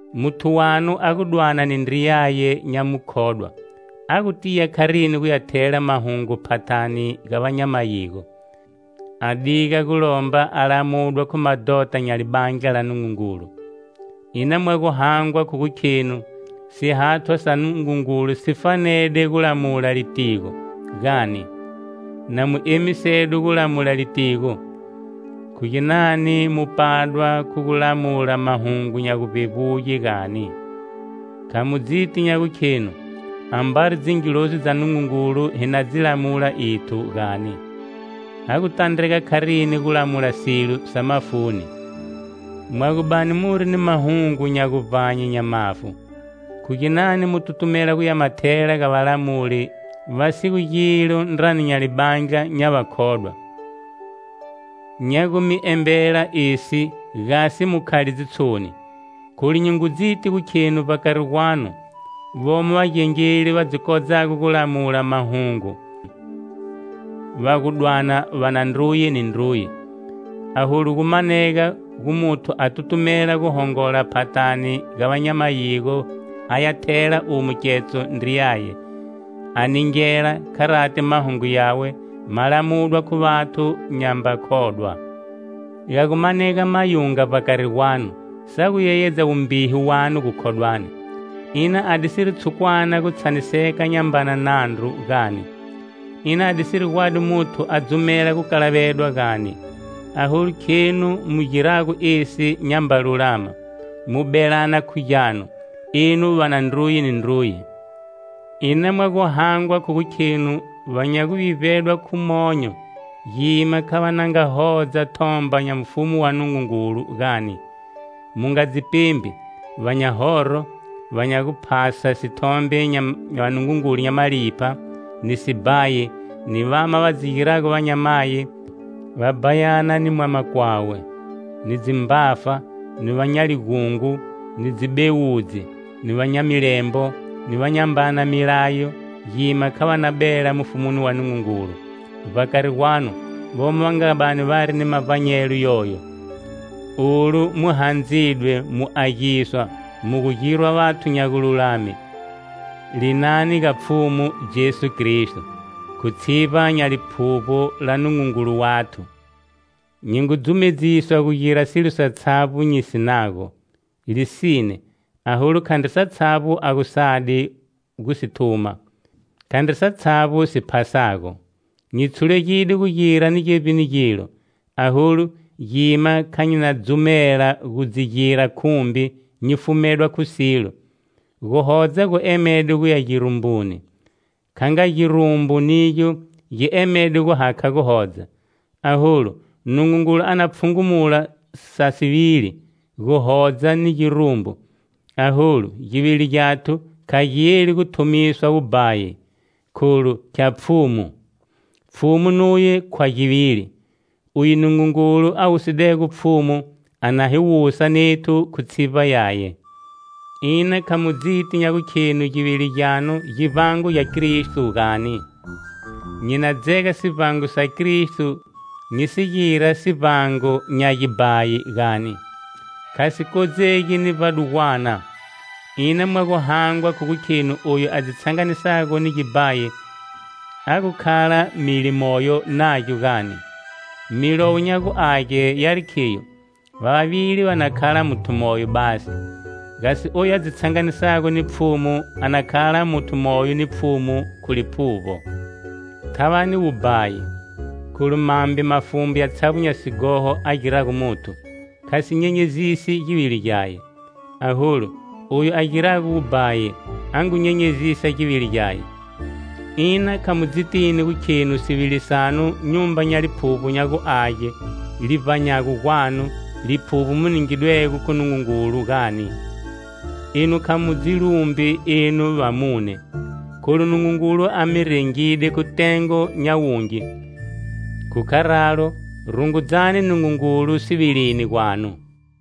Muthu wanu a gu dwana ni ndriyaye nya mukhodwa, a gu tiya kharini guya thela mahungu phathani ga va nya mayigo, a diga gu lomba a lamudwa khu madhota nya Libandla la Nungungulu? Ina mwa gu hangwa khu gu khenu sihathwa sa Nungungulu si fanede gu lamula litigo, gani? Na mu emisedwe gu lamula litigo, khu ginani mu padwa khu gu lamula mahungu nya guvbevbuge, gani? Kha mu dzitini nya gukhenu, ambari dzingilozi dza Nungungulu hi na dzi lamula ethu, gani? Ha gu tandrega kharini gu lamula silo sa mafuni? Mwa gu bani muri ni mahungu nya guvbanye nya mafu, khu ginani mu tutumela guya ma thela ga valamuli va si gu gilo ndrani nya libandla nya vakhodwa? Nya gu mi embela esi gasi mu khale dzitshoni, kholu nyi ngu dziti gu kheni vbakari gwanu vomo vagengeli va dzi kodzago gu lamula mahungu, va gu dwana va na ndruye ni ndruye. Aholu, gu manega gu muthu a tutumela gu hongola phathani ga va nya mayigo aya thela umo ketso ndriyaye; a ningela, kharati mahungu yawe ma lamudwa khu vathu nyamba khodwa. Ga gu manega mayunga vbakari gwanu sa gu yeyedza wumbihu wanu gukhodwani. Ina adisiri tshukwana gu tshaniseka nyambana nandru, gani? Ina adisiri gwadi muthu a dzumela gukalavedwa, gani? Aholu khenu mu girago esi nyamba lulama, mu belana khu gyanu, enu va na ndruye ni ndruye! Ina mwa gu hangwa khu gu khenu va nya guvivbedwa khu monyo, gima kha va na nga hodza thomba nya mufumu wa Nungungulu, gani? Mu nga dzi pembi! Va nya horo, va nya guphasa sithombe nya vanungungulu nya malipha, ni sibhayi, ni vama va dzi girago vanyamayi,va bhayana khu ni mwama kwawe, ni dzimbafa, ni va nya ligungo, ni dzibewudzi, ni va nya milembo, ni va nyambana milayo gima kha va na bela mufumuni wa Nungungulu. Vbakari gwanu vomo va nga bani vari ni mavbanyelo yoyo. Olu mu handzidwe, mu agiswa, mu gu girwa vathu nya gululame linani ga Pfhumu Jesu Kristo, khu tshivba nya Liphuvbo la Nungungulu wathu. Nyi ngu dzumedziswa gu gira silo satshavbo nyi sinago. Lisine; aholu khandri satshavbo a gu sadi gu si thuma; khandri satshavbo si phasago. Nyi tshulegide gu gira ni gevbini gilo, aholu gima kha nyi na dzumela gu dzi gira khumbi nyi fumedwa khu silo. Guhodza gu emede guya girumbuni, kha nga girumbu nigyo gi emedego guhakha guhodza. Aholu, Nungungulu a na pfhungunula sa sivili: guhodza ni girumbu. Aholu, givili gyathu kha gi yeli gu thumiswa wubhayi, kholu khya Pfhumu, Pfhumu nuye khwa givili. Uye Nungungulu a wusidego Pfhumu a na hi wusa nethu khu tshivba yaye. Ina kha mu dzitini nya gukhenu givili gyanu givbango gya kristo, gani? Nyi na dzega sivbango sa Kristo nyi si gira sivbango nya gibhayi, gani? Kha si kodzegi ni vbadugwana! Ina mwa gu hangwa khu gu khenu oyu a dzi tshanganisago ni gibhayi a gu khala mili moyo nagyo, gani? Milowo nya gu Age yari khiyo: "Va vavili va na khala muthu moyo basi." Gasi oyu a dzi tshanganisago ni Pfhumu a na khala muthu moyo ni Pfhumu khu liphuvbo. Thavani wubhayi! Kholu mambe mafumbu yatshavbo nya sighoho a girago muthu, kha si nyenyezisi givili gyaye. Aholu, oyu a girago wubhayi a ngu nyenyezisa givili gyaye. Ina kha mu dzitini gu khenu sivili sanu nyumba nya Liphuvbo nya gu Age, li vbanyago gwanu; Liphuvbo mu ningidwego khu Nungungulu, gani? Enu kha mu dzi lumbi enu vamune, kholu Nungungulu a mi rengide khu tengo nya wungi. Khu kharalo, rungudzani Nungungulu sivilini gwanu.